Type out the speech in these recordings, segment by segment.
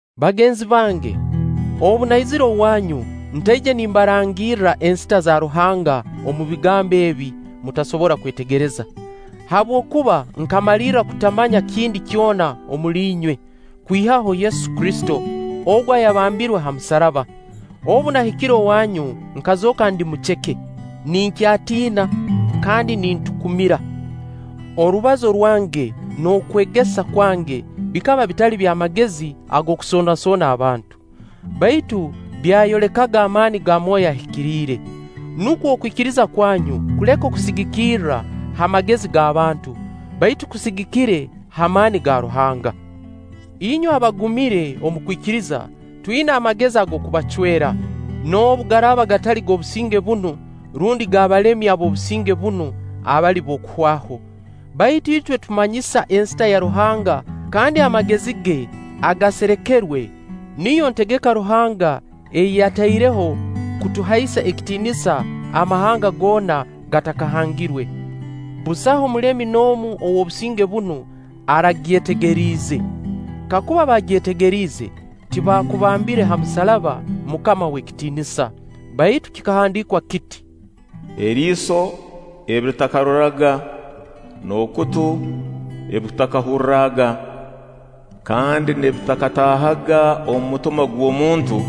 Bagenzi bange, obu naizire owanyu, ntaije nimbarangirra ensita za Ruhanga omu bigambo ebi mutasobora kwetegereza. Habwokuba nkamalirra kutamanya kindi kyona omuli inywe, kwihaho Yesu Kristo, ogu ayambambirwe ha musaraba. Obu nahikire owanyu nkazooka ndi muceke, ninkyatiina, kandi nintukumira. Orubazo rwange n'okwegeza kwange bikaba bitali by'amagezi ag'okusoonasoona abantu; baitu byayolekaga amaani ga Mwoyo Ahikiriire. Nukwo okwikiriza kwanyu kuleke kusigikira ha magezi g'abantu, baitu kusigikire ha maani ga Ruhanga. Inywe abagumire omu kwikiriza, twina amagezi ag'okubacwera, noobu garaaba gatali g'obusinge bunu rundi g'abalemi ab'obusinge bunu abali b'okuhwaho. Baitu itwe tumanyisa ensita ya Ruhanga kandi amagezi ge agaserekerwe, niyo ntegeka Ruhanga ei yataireho kutuhaisa ekitiinisa amahanga goona gatakahangirwe. Busaho mulemi n'omu ow'obusinge bunu aragyetegeriize. Kakuba baagyetegeriize, tibaakubambire ha musaraba MUKAMA ow'ekitiinisa. Baitu kikahandiikwa kiti: “Eriiso ebi litakaroraga, n'okutu ebi kutakahurraga, kandi n'ebitakataahaga omu mutima gw'omuntu,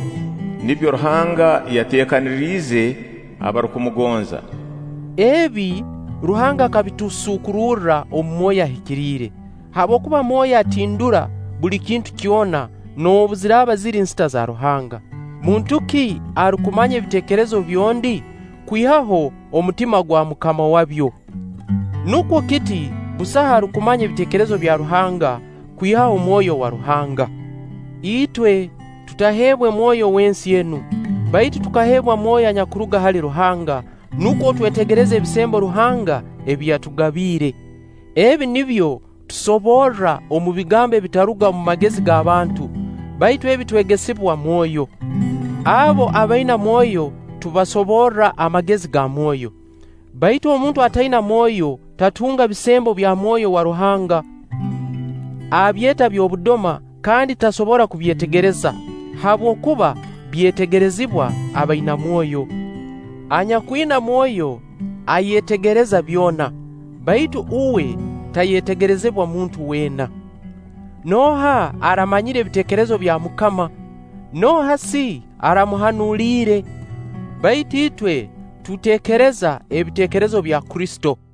nibyo Ruhanga yateekaniriize abarukumugonza.” Ebi, Ruhanga akabitusuukururra omu Mwoyo Ahikiriire, Habwokuba Mwoyo atindura buli kintu kyona noobu ziraaba ziri nsita za Ruhanga. Muntu ki arukumanya ebiteekerezo by'ondi, kwihaho omutima gwa mukama wabyo? Nukwo kiti, busaho arukumanya ebiteekerezo bya Ruhanga kwihaho Mwoyo wa Ruhanga. Itwe, tutaheebwe mwoyo w'ensi enu, baitu tukaheebwa Mwoyo anyakuruga hali Ruhanga, nukwo twetegereze ebisembo Ruhanga ebi yatugabiire. Ebi nibyo tusoborra omu bigambo ebitaruga omu magezi g'abantu, baitu ebi twegesibwa Mwoyo. Abo abaina Mwoyo, tubasoborra amagezi ga Mwoyo. Baitu omuntu ataina Mwoyo tatunga bisembo bya mwoyo wa Ruhanga. Abyeeta by'obudoma kandi tasobora kubyetegereza, habwokuba byetegerezibwa abaina mwoyo. Anyakwina Mwoyo ayetegereza byona, baitu uwe tayetegerezibwa muntu weena. “Nooha aramanyire ebiteekerezo bya MUKAMA, nooha si aramuhanuliire?” Baitu itwe tuteekereza ebiteekerezo bya Kristo.